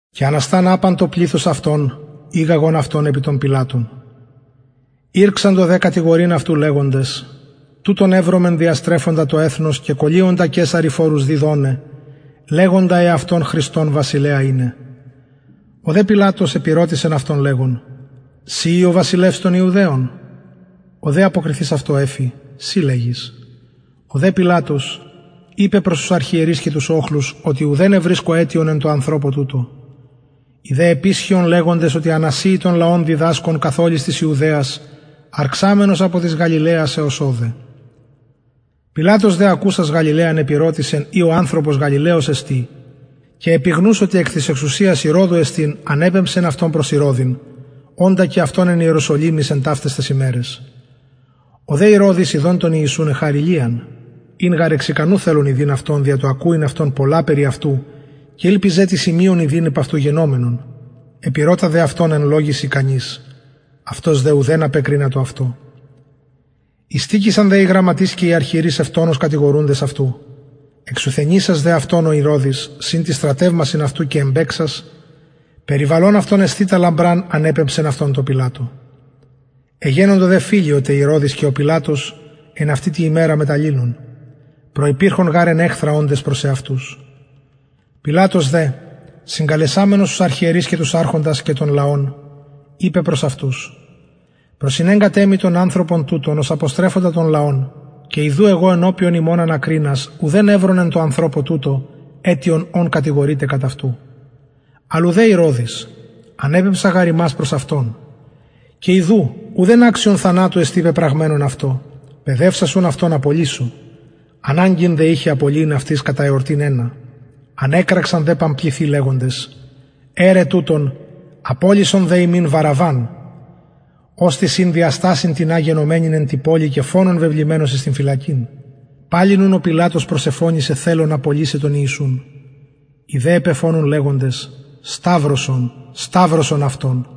και ανασταν απαν το πληθος αυτων ηγαγον αυτον επι τον πιλατον ηρξαντο δε κατηγορειν αυτου λεγοντες τουτον ευρομεν διαστρεφοντα το εθνος και κωλυοντα καισαρι φορους διδοναι λεγοντα εαυτον χριστον βασιλεα ειναι ο δε πιλατος επηρωτησεν αυτον λεγων συ ει ο βασιλευς των ιουδαιων ο δε αποκριθεις αυτω εφη συ λεγεις ο δε πιλατος ειπεν προς τους αρχιερεις και τους οχλους ουδεν ευρισκω αιτιον εν τω ανθρωπω τουτω οι δε επισχυον λεγοντες οτι ανασειει τον λαον διδασκων καθ ολης της ιουδαιας αρξαμενος απο της γαλιλαιας εως ωδε πιλατος δε ακουσας γαλιλαιαν επηρωτησεν ει ο ανθρωπος γαλιλαιος εστιν και επιγνους οτι εκ της εξουσιας ηρωδου εστιν ανεπεμψεν αυτον προς ηρωδην οντα και αυτον εν ιεροσολυμοις εν ταυταις ταις ημεραις ο δε ηρωδης ιδων τον ιησουν εχαρη λιαν ην γαρ θελων εξ ικανου ιδειν αυτον δια το ακουειν πολλα περι αυτου και ηλπιζεν τι σημειον ιδειν υπ αυτου γινομενον επηρωτα δε αυτον εν λογοις ικανοις αυτος δε ουδεν απεκρινατο αυτω ειστηκεισαν δε οι αρχιερεις και οι γραμματεις ευτονως κατηγορουντες αυτου εξουθενησας δε αυτον ο ηρωδης συν τοις στρατευμασιν αυτου και εμπαιξας περιβαλων αυτον εσθητα λαμπραν ανεπεμψεν αυτον τω πιλατω εγενοντο δε φιλοι ο τε πιλατος και ο ηρωδης εν αυτη τη ημερα μετ αλληλων προυπηρχον γαρ εν εχθρα οντες προς εαυτους πιλατος δε συγκαλεσαμενος τους αρχιερεις και τους αρχοντας και τον λαον ειπεν προς αυτους προσηνεγκατε μοι τον ανθρωπον τουτον ως αποστρεφοντα τον λαον και ιδου εγω ενωπιον υμων ανακρινας ουδεν ευρον εν τω ανθρωπω τουτω αιτιον ων κατηγορειτε κατ αυτου αλλ ουδε ηρωδης ανεπεμψα γαρ υμας προς αυτον και ιδου ουδεν αξιον θανατου εστιν πεπραγμενον αυτω παιδευσας ουν αυτον απολυσω αναγκην δε ειχεν απολυειν αυτοις κατα εορτην ενα ανεκραξαν δε παμπληθει λεγοντες αιρε τουτον απολυσον δε ημιν βαραββαν οστις ην δια στασιν τινα γενομενην εν τη πολει και φονον βεβλημενος εις φυλακην παλιν ουν ο πιλατος προσεφωνησεν θελων απολυσαι τον ιησουν οι δε επεφωνουν λεγοντες σταυρωσον σταυρωσον αυτον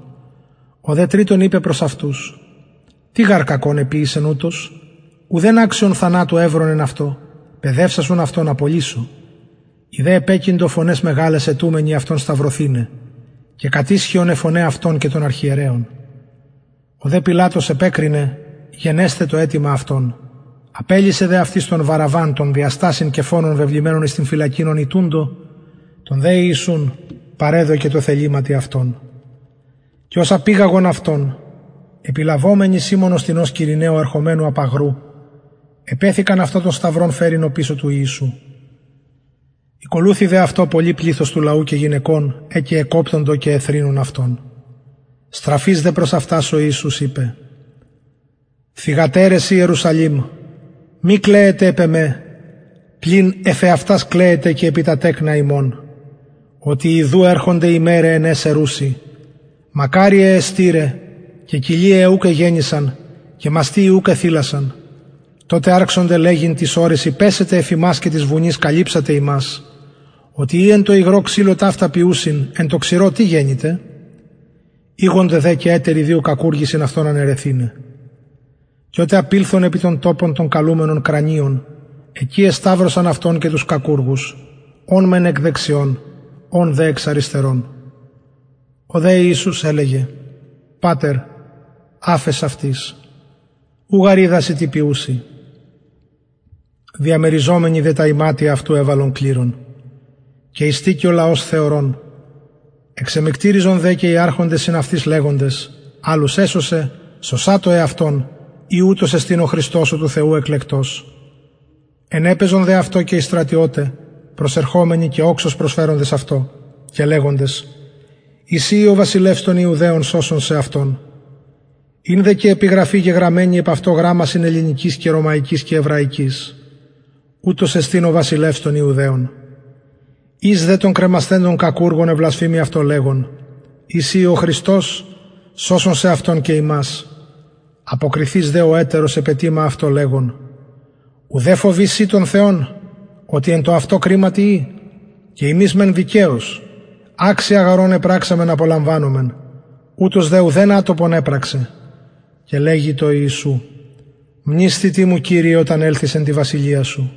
ο δε τριτον ειπεν προς αυτους τι γαρ κακον εποιησεν ουτος ουδεν αιτιον θανατου ευρον εν αυτω παιδευσας ουν αυτον απολυσω οι δε επεκειντο φωναις μεγαλαις αιτουμενοι αυτον σταυρωθηναι και κατισχυον αι φωναι αυτων και των αρχιερεων ο δε πιλατος επεκρινεν γενεσθαι το αιτημα αυτων απελυσεν δε τον δια στασιν και φονον βεβλημενον εις την φυλακην ον ητουντο τον δε ιησουν παρεδωκεν τω θεληματι αυτων και ως απηγαγον αυτον επιλαβομενοι σιμωνος τινος κυρηναιου ερχομενου απ αγρου επεθηκαν αυτω τον σταυρον φερειν οπισθεν του ιησου ηκολουθει δε αυτω πολυ πληθος του λαου και γυναικων αι και εκοπτοντο και εθρηνουν αυτον στραφεις δε προς αυτας ο ιησους ειπεν θυγατερες ιερουσαλημ μη κλαιετε επ εμε πλην εφ εαυτας κλαιετε και επι τα τεκνα υμων οτι ιδου ερχονται ημεραι εν αις ερουσιν μακαριαι αι στειραι και κοιλιαι αι ουκ εγεννησαν και μαστοι οι ουκ εθηλασαν τοτε αρξονται λεγειν τοις ορεσιν πεσετε εφ ημας και τοις βουνοις καλυψατε ημας οτι ει εν τω υγρω ξυλω ταυτα ποιουσιν εν τω ξηρω τι γενηται ηγοντο δε και ετεροι δυο κακουργοι συν αυτω αναιρεθηναι και οτε απηλθον επι τον τοπον τον καλουμενον κρανιον εκει εσταυρωσαν αυτον και τους κακουργους ον μεν εκ δεξιων ον δε εξ αριστερων ο δε ιησους ελεγεν πατερ αφες αυτοις ου γαρ οιδασιν τι ποιουσιν διαμεριζομενοι δε τα ιματια αυτου εβαλον κληρον και ειστηκει ο λαος θεωρων εξεμυκτηριζον δε και οι αρχοντες συν αυτοις λεγοντες αλλους εσωσεν σωσατω εαυτον ει ουτος εστιν ο χριστος ο του θεου εκλεκτος ενεπαιζον δε αυτω και οι στρατιωται προσερχομενοι και οξος προσφεροντες αυτω και λεγοντες ει συ ει ο βασιλευς των ιουδαιων σωσον σεαυτον ην δε και επιγραφη γεγραμμενη επ αυτω γραμμασιν ελληνικοις και ρωμαικοις και εβραικοις ουτος εστιν ο βασιλευς των ιουδαιων εις δε των κρεμασθεντων κακουργων εβλασφημει αυτον λεγων ει συ ει ο χριστος σωσον σεαυτον και ημας αποκριθεις δε ο ετερος επετιμα αυτω λεγων ουδε φοβη συ τον θεον οτι εν τω αυτω κριματι ει και ημεις μεν δικαιως αξια γαρ ων επραξαμεν απολαμβανομεν ουτος δε ουδεν ατοπον επραξεν και ελεγεν τω ιησου μνησθητι μου κυριε οταν ελθης εν τη βασιλεια σου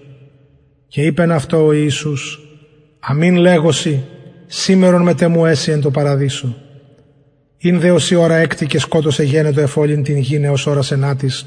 και ειπεν αυτω ο ιησους αμην λεγω σοι σημερον μετ εμου εση εν τω παραδεισω ην δε ωσει ωρα εκτη και σκοτος εγενετο εφ ολην την γην εως ωρας ενατης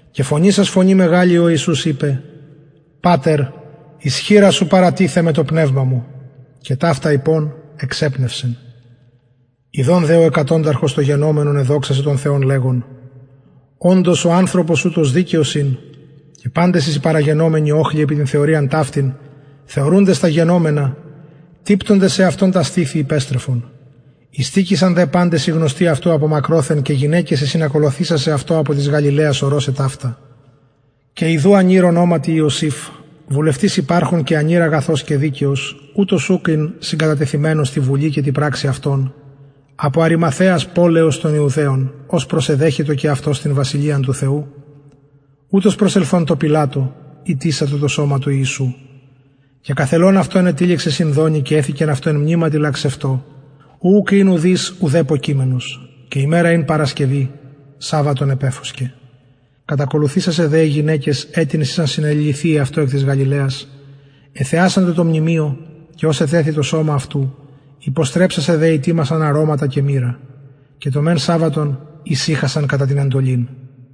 και φωνησας φωνη μεγαλη ο ιησους ειπεν πατερ εις χειρας σου παραθησομαι το πνευμα μου και ταυτα ειπων εξεπνευσεν ιδων δε ο εκατονταρχος το γενομενον εδοξασεν τον θεον λεγων οντως ο ανθρωπος ουτος δικαιος ην και παντες οι συμπαραγενομενοι οχλοι επι την θεωριαν ταυτην θεωρουντες τα γενομενα τυπτοντες εαυτων τα στηθη υπεστρεφον ειστηκεισαν δε παντες οι γνωστοι αυτου μακροθεν και γυναικες αι συνακολουθησασαι αυτω απο της γαλιλαιας ορωσαι ταυτα και ιδου ανηρ ονοματι ιωσηφ βουλευτης υπαρχων ανηρ αγαθος και δικαιος ουτος ουκ ην συγκατατεθειμενος τη βουλη και τη πραξει αυτων απο αριμαθαιας πολεως των ιουδαιων ος και προσεδεχετο και αυτος την βασιλειαν του θεου ουτος προσελθων τω πιλατω ητησατο το σωμα του ιησου και καθελων αυτο ενετυλιξεν αυτο σινδονι και εθηκεν αυτο εν μνηματι λαξευτω ου ουκ ην ουδεπω ουδεις κειμενος και ημερα ην παρασκευη σαββατον επεφωσκεν κατακολουθησασαι δε γυναικες αιτινες ησαν συνεληλυθυιαι αυτω εκ της γαλιλαιας εθεασαντο το μνημειον και ως ετεθη το σωμα αυτου υποστρεψασαι δε ητοιμασαν αρωματα και μυρα και το μεν σαββατον ησυχασαν κατα την εντολην